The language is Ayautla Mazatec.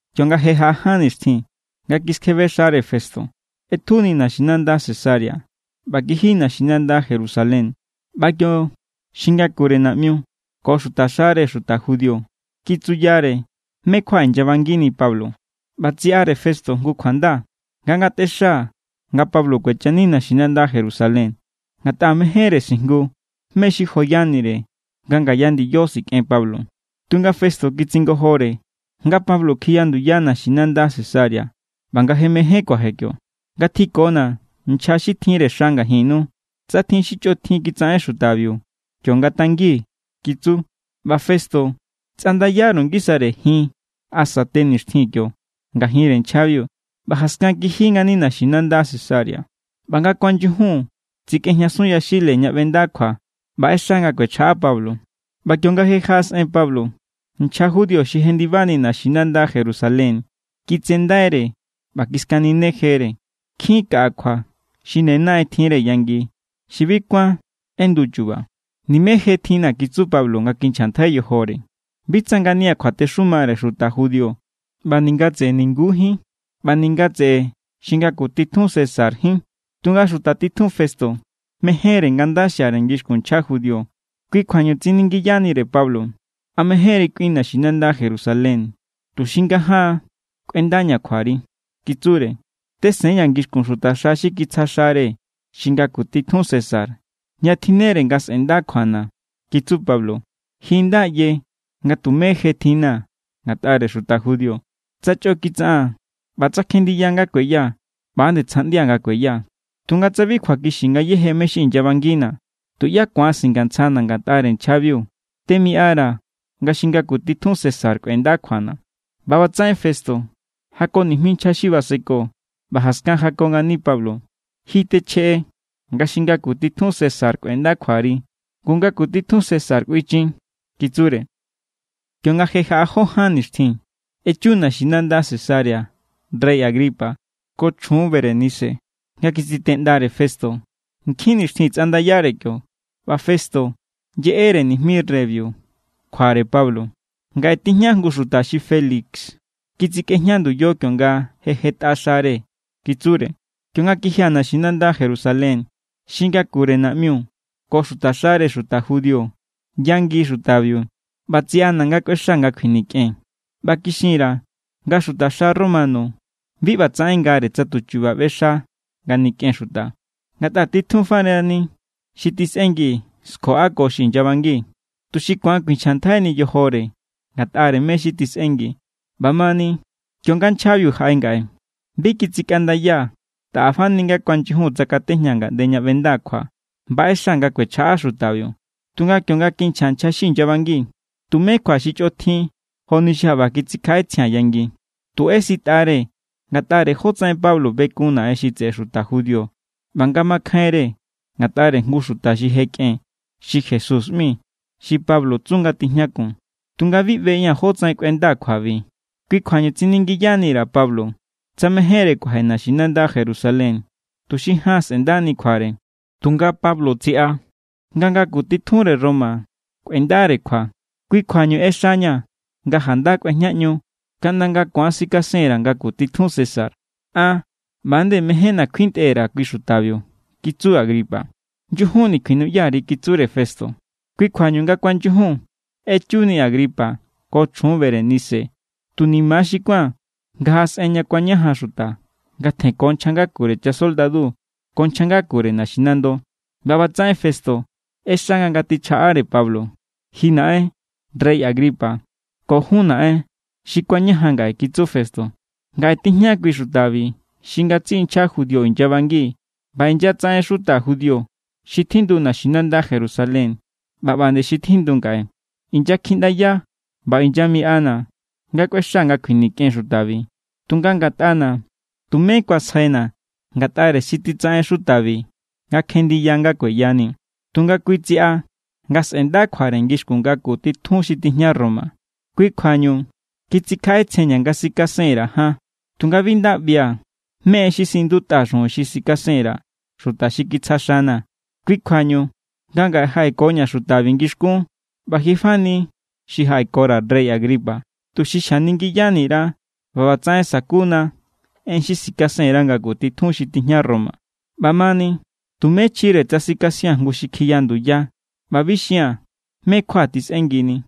Kionga je jaꞌa ján nixtjin nga kiskjebe xare Festo, ꞌetjuni naxinanda Cesarea ꞌba kiji naxinanda Jerusalén. ꞌBa kio xi ngakure naꞌmiu ko xutaxare xuta judío kitsuyare mé= kjua inyabangini Pablo. ꞌBa tsiꞌare Festo jngu kjuanda, nga ngatꞌexa nga Pablo kuechani naxinanda Jerusalén, ngatꞌa mejénre sijngu mé= xi joyanire, nga ngaya ndiyo sikꞌen Pablo. Tunga Festo kitsingojore nga Pablo kjiya nduya naxinanda Cesarea ꞌba nga je mején kuaje kio. —Ngatjikona̱ nchja xi tjinre xa ngajinnu. Tsa tjin xi chꞌotjin kitsaꞌen xutabiu, kiongatangi —kitsu. ꞌBa Festo tsꞌandayaru ngisare jin asa te nixtjin kiongajinre nchjabiu, ꞌba jaskan kiji ngani naxinanda Cesarea. ꞌBa nga kuanyujun tsikꞌejñasun yaxile ña ꞌbenda kjua ꞌba ꞌexa nga kuechjaꞌa Pablo. ꞌBa kionga je jaꞌasꞌen Pablo, nchja judío xi jendibani naxinanda Jerusalén kitsendaire ꞌba kiskaninejere. Nkjin kaꞌa kjua xi ne naꞌen tjinre yangi xi bi kuán ꞌendu chuba. —Nimé je tjinna̱ —kitsu Pablo nga kinchjantjai yojore—. Bi tsa ngania̱ kjuatexumare xuta judío ꞌba ninga tseꞌe ningujín ꞌba ninga tseꞌe xi ngaku titjun Césarjín. Tunga xuta titjun Festo mejénre nga nda xiare ngixkun nchja judío. Kui kjuañu tsiningiyanire Pablo: —¿A mejénri kꞌuin naxinanda Jerusalén tuxi ngajaan kꞌuendaña̱ kjuari? —kitsure. —Tesenña̱ ngixkun xuta xi kitsja xare xi ngaku titjun César, ña tjinnere nga sꞌe̱nda kjuana̱ —kitsu Pablo—. Ji nda ꞌye nga tumé je tjinna̱ ngatꞌare xuta judío. Tsa chꞌo kitsaꞌaa̱n ꞌba tsa kjendiya nga kueya, ꞌba=nde tsjaꞌndia̱ nga kueya. Tunga tsa bi kjuakixi ngayéje mé= xi inyabangina̱, tuꞌyá ku̱an singantsjana̱ ngatꞌare nchjabiu. Temiꞌara̱ nga xi ngaku titjun César kꞌuenda kjuana̱. ꞌBa ꞌbatsaꞌen Festo jako nijmi nchja xi baseko, ꞌba jaskan jako ngani Pablo: —Ji techjeꞌe nga xi ngaku titjun César kꞌuenda kjuari. Ngu ngaku titjun César kꞌuinchin —kitsure. Kionga je jaꞌa jó ján nixtjin, echu naxinanda Cesarea rey Agripa ko chjun Berenice nga kitsiteꞌndare Festo. Nkjin nixtjin tsꞌandayare kio, ꞌba Festo yeꞌere nijmi reybiu kjuare Pablo. —Ngaꞌe tijña jngu xuta xi Félix kitsikꞌejña nduyo kionga jetꞌare xare —kitsure—. Kionga kijia̱ naxinanda Jerusalén, xi ngakure naꞌmiu ko xutaxare xuta judío yangi xutabiu ꞌba tsiꞌana̱ nga kꞌuexaa̱ nga kjuinikꞌen. ꞌBa kixin_ra̱ nga xutaxa romano bi ꞌbatsaꞌen ngare tsa tuchuba ꞌbexa nga nikꞌen xuta. Ngatꞌa titjun farani xi tisꞌengi skjoꞌako xi inyabangi, tuxi ku̱an kjuinchjantjaini yojore ngatꞌare mé= xi tisꞌengi. ’ꞌBamani, kionga nchjabiu jaꞌe ngaꞌe, bi kitsikꞌandayaa̱. Taꞌa fani nga kuanyujun tsakatejñaa̱ ngaꞌnde ña ꞌbendaa̱ kjua ꞌba ꞌexa nga kuechjaꞌa xutabiu. Tunga kionga kinchja nchja xi inyabangi, tumé kjua xi chꞌotjin joni xi jaꞌba kitsikjaꞌetsjia̱n yangi. Tu ꞌesitꞌare ngatꞌare jotsaꞌen Pablo bekun Naꞌen xi tseꞌe xuta judío ꞌba nga makjainre ngatꞌare jngu xuta xi je kꞌen xi Jesús ꞌmi, xi Pablo tsu nga tijñakun. ’Tunga bi ꞌbeꞌia̱n jótsaꞌen kꞌuendaa̱ kjuabi. Kui kjuañu tsiningiyani_ra̱ Pablo tsa mejénre kuaje naxinanda Jerusalén, tuxi jaan sꞌe̱ndani kjuare. Tunga Pablo tsiꞌa nga ngaku titjunre Roma kꞌuendare kjua. Kui kjuañu ꞌexañaa̱ nga janda kꞌuejñaꞌñu kaꞌnda nga ku̱an sikasenra̱ ngaku titjun César. —An= ꞌba=nde mejénna̱ kjuintꞌe_ra̱ kui xutabiu —kitsu Agripa. —Nyujunni kjuinuꞌya_ri —kitsure Festo. Kui kjuañu nga kuanyujun, echuni Agripa ko chjun Berenice. Tu ni̱ma̱= xi kuán nga jaꞌasꞌen ña kuañajan xuta nga tjenko nchja ngakure chasoldadu ko nchja ngakure naxinando. ꞌBa ꞌbatsaꞌen Festo ꞌexa nga ngatichjaꞌare Pablo. —Ji naꞌen rey Agripa ko jun naꞌen xi kuañajan ngaꞌe —kitsu Festo—, ngaꞌe tijña kui xutabi xi ngatsiꞌi nchja judío inyabangi. ꞌBa inyatsaꞌen xuta judío xi tjindu naxinanda Jerusalén ꞌba ꞌba nde xi tjindu ngaꞌe. Inyakjiꞌndaya nga inyamiꞌana̱ nga kꞌuexaa̱ nga kjuinikꞌen xutabi. Tunga ngatꞌana̱, tumé kuasjaina̱ ngatꞌare xi kitsaꞌen xutabi nga kjenndiya nga kueyani. Tunga kui tsiꞌa nga sꞌe̱nda kjuare ngixkun ngaku titjun xi tijña Roma. Kui kjuañu kitsikjaꞌetsjenña̱ nga sikasen_ra̱ jaan. ’Tunga bi nda ꞌbia̱ mé= en xi siꞌindutꞌa xujun xi sikasen_ra̱ xuta xi kitsja xana̱. Kui kjuañu nga ngaꞌe jaꞌekoña̱ xutabi ngixkún ꞌba ji fani xi jaꞌekora̱, rey Agripa, tuxi xjaningiyani_ra ꞌba ꞌbatsaꞌen sa̱kuna en xi sikasen_ra̱ ngaku tijun xi tijña Roma. ꞌBamani tumé chjire tsa sikasia̱n jngu xi kjiya nduya ꞌba bi xia̱n mé= kjua tisꞌengini.